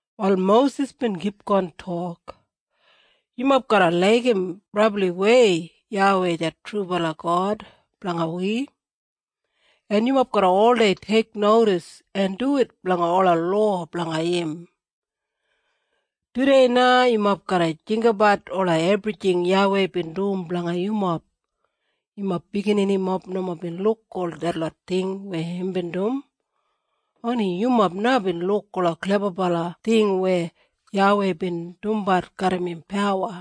Wal Mosis bin kipgon tok, “Yumob garra laigim brabliwei YAWEI det trubala God blanga wi, en yumob garra oldei teiknodis en duwit blanga ola lowa blanga im. Tudei na yumob garra jinggabat ola ebrijing YAWEI bin dum blanga yumob. Yumob bigininimob nomo bin luk ol detlot ting weya imbin dum. Oni yumob na bin luk ola klebabala ting weya YAWEI bin dumbat garram im pawa.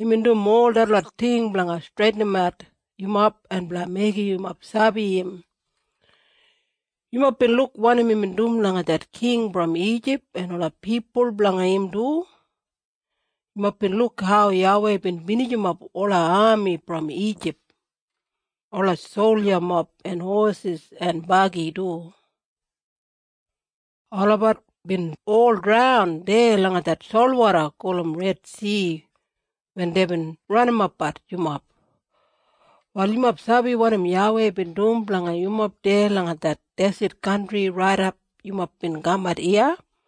Imbin dum ol detlot ting blanga streitinimat yumob en blanga meigim yumob sabi im. Yumob bin luk wanim imbin dum langa det king brom Ijip en ola pipul blanga im du. Yumob bin luk hau YAWEI bin binijimap ola ami brom Ijip, ola soljamob en hosis en bagi du. Olabat bin ol draun deya langa det solwoda gulum Redsi wen deibin ranimapbat yumob. Wal yumob sabi wanim YAWEI bin dum blanga yumob deya langa det deset kantri raidap yumob bin kamat iya.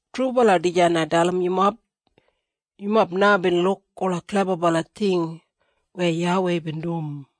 Trubala dijan ai dalim yumob. Yumob na bin luk ola klebabala ting weya YAWEI bin dum.”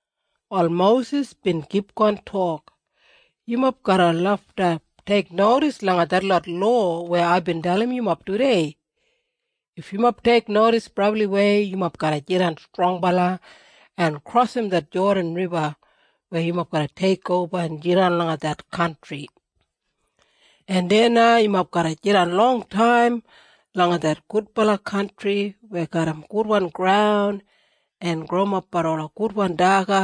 Wal Mosis bin kipgon tok, “Yumob garra lafta teiknodis langa detlot lowa weya aibin dalimbat yumob tudei. If yumob teiknodis brabliwei yumob garra jidan strongbala en krosim det Jodan Riba weya yumob garra teikoba en jidan langa det kantri. En deya na yumob garra jidan longtaim langa det gudbala kantri weya garram gudwan graun en growimapbat ola gudwan daga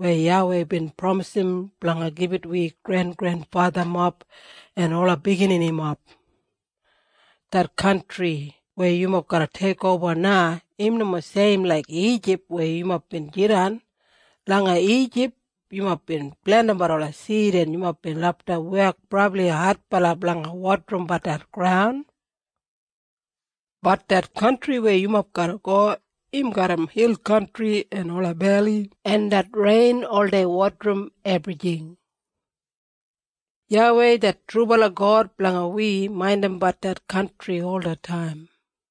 weya YAWEI bin pramisim blanga gibit wi grengrenfathamob en ola bigininimob. Det kantri weya yumob garra teikoba na, im nomo seim laik Ijip weya yumob bin jidan. Langa Ijip yumob bin plentimbat ola sid en yumob bin lafta wek brabli adbala blanga wodarimbat det graun. Bat det kantri weya yumob garra go im garram hil kantri en ola beli en det rein oldei wodarim ebrijing. YAWEI det trubala God blanga wi maindimbat det kantri olataim.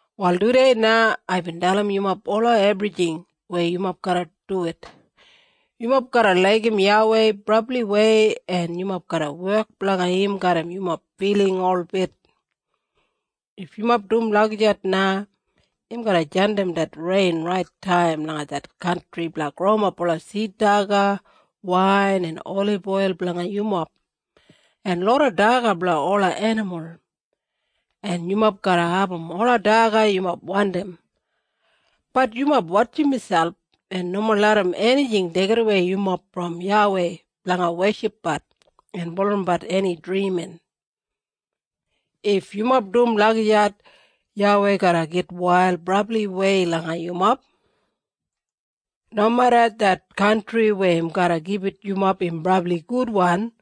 “Wal tudei na aibin dalim yumob ola ebrijing weya yumob garra duwit. Yumob garra laigim YAWEI brabliwei en yumob garra wek blanga im garram yumob filing holbit. If yumob dum lagijat na im garra jandim det rein rait taim langa det kantri blanga growimap ola sid daga, wain en oliboil blanga yumob, en loda daga blanga ola enimul. En yumob garra abum ola daga yumob wandim. Bat yumob wotjim miselp en nomo larram enijing deigimwei yumob brom YAWEI blanga weshipbat en bulurrumbat eni drimin. If yumob dum lagijat YAWEI garra gitwail brabliwei langa yumob. Nomeda det kantri weya im garra gibit yumob im brabli gudwan,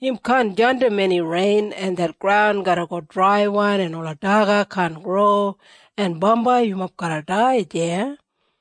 im kaan jandim eni rein, en det graun garra go draiwan en ola daga kaan gro, en bambai yumob garra dai deya.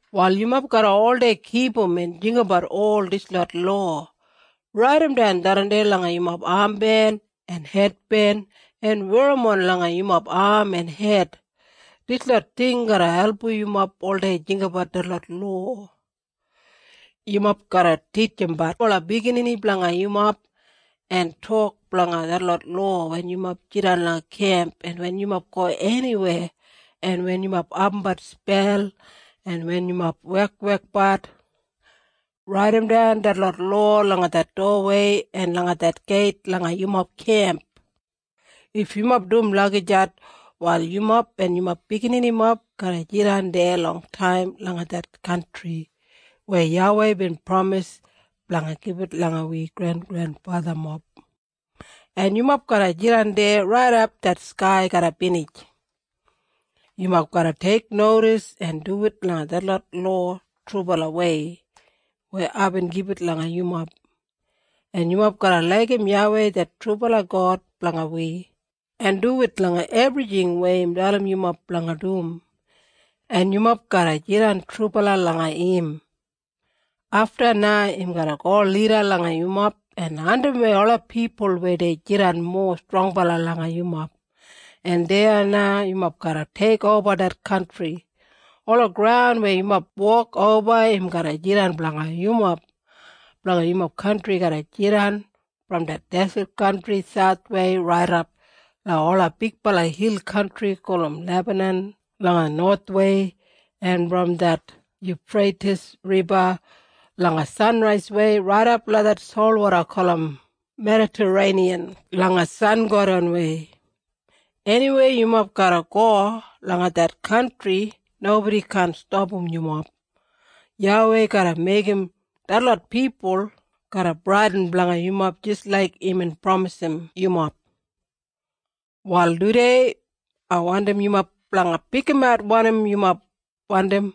“Wal yumob garra oldei kipum en jinggabat ol dislot lowa. Raidimdan tharran langa yumob amben en hedben en werrimon langa yumob am en hed. Dislot ting garra album yumob oldei jinggabat detlot lowa. Yumob garra titjimbat ola biginini blanga yumob, en tok blanga detlot lowa wen yumob jidan langa kemp en wen yumob go eniweya, en wen yumob abumbat spel en wen yumob wekwekbat. Raidimdan detlot lowa langa det dowawei en langa det geit langa yumob kemp. If yumob dum lagijat, wal yumob en yumob bigininimob garra jidan deya longtaim langa det kantri weya YAWEI bin pramis blanga gibit langa wi grengrenfathamob. En yumob garra jidan deya raidap det skai garra binij. “Yumob garra teiknodis en duwit langa detlot lowa trubalawei weya aibin gibit langa yumob. En yumob garra laigim YAWEI det trubala God blanga wi, en duwit langa ebrijing weya im dalim yumob blanga dum. En yumob garra jidan trubala langa im. Afta na im garra go lida langa yumob en andimwei ola pipul weya dei jidan mowa strongbala langa yumob, en deya na yumob garra teikoba det kantri. Ola graun weya yumob wok oba im garra jidan blanga yumob. Blanga yumob kantri garra jidan brom det deset kantri sauthwei raidap langa ola bigbala hil kantri gulum Lebanan langa nowathwei, en brom det Yufreitis Riba langa sanraiswei raidap langa det solwoda gulum Medatareiniyan langa sangodanwei. Eniweya yumob garra go langa det kantri nobodi kaan stapam yumob. YAWEI garra meigim detlot pipul garra bradin blanga yumob jis laik imbin pramisim yumob. “Wal tudei na ai wandim yumob blanga pikimat wanim yumob wandim.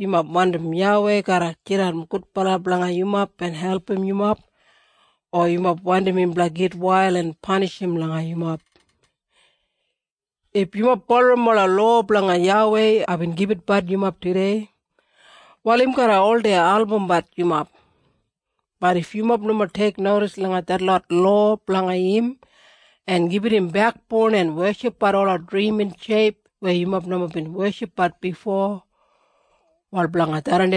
Yumob wandim YAWEI garra jidan gudbala blanga yumob en album yumob, o yumob wandim im blanga gitwail en panishim langa yumob? If yumob bulurrum ola lowa blanga YAWEI aibin gibitbat yumob tudei, wal im garra oldei albumbat yumob. Bat if yumob nomo teiknodis langa detlot lowa blanga im en gibit im bekboun en weshipbat ola drimin sheip weya yumob nomo bin weshipbat bifo, wal blanga tharran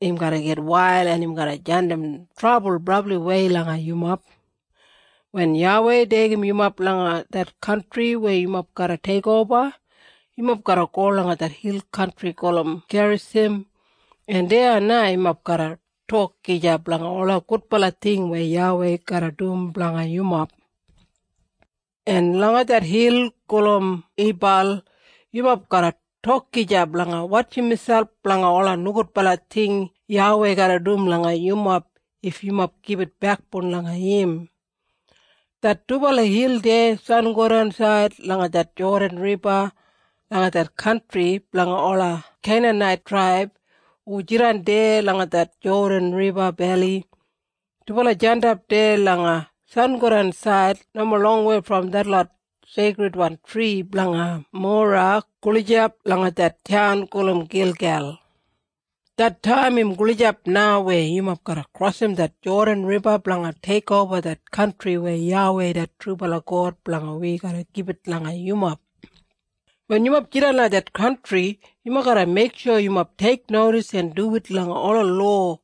im garra gitwail en im garra jandim trabul brabliwei langa yumob. Wen YAWEI deigim yumob langa det kantri weya yumob garra teikoba, yumob garra go langa det hil gulum Gerisim en deya na yumob garra tok gija blanga ola gudbala ting weya YAWEI garra dum blanga yumob. En langa det hil gulum Ibal yumob garra tok gija blanga wotjim miselp blanga ola nogudbala ting YAWEI garra dum langa yumob if yumob gibit bekboun langa im. Det dubala hil deya sangodansaid langa det Jodan Riba langa det kantri blanga ola Keinanait traib hu jidan deya langa det Jodan Riba Beli. Dubala jandap deya langa sangodansaid nomo longwei brom detlot seikridwan tri blanga Mora gulijap langa det taun gulum Gilgel. Det taim im gulijap na weya yumob garra krosim det Jodan Riba blanga teikoba det kantri weya YAWEI det trubala God blanga wi garra gibit langa yumob. Wen yumob jidan langa det kantri, yumob garra meiksho yumob teiknodis en duwit langa ola lowa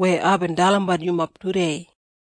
weya aibin dalimbat yumob tudei.”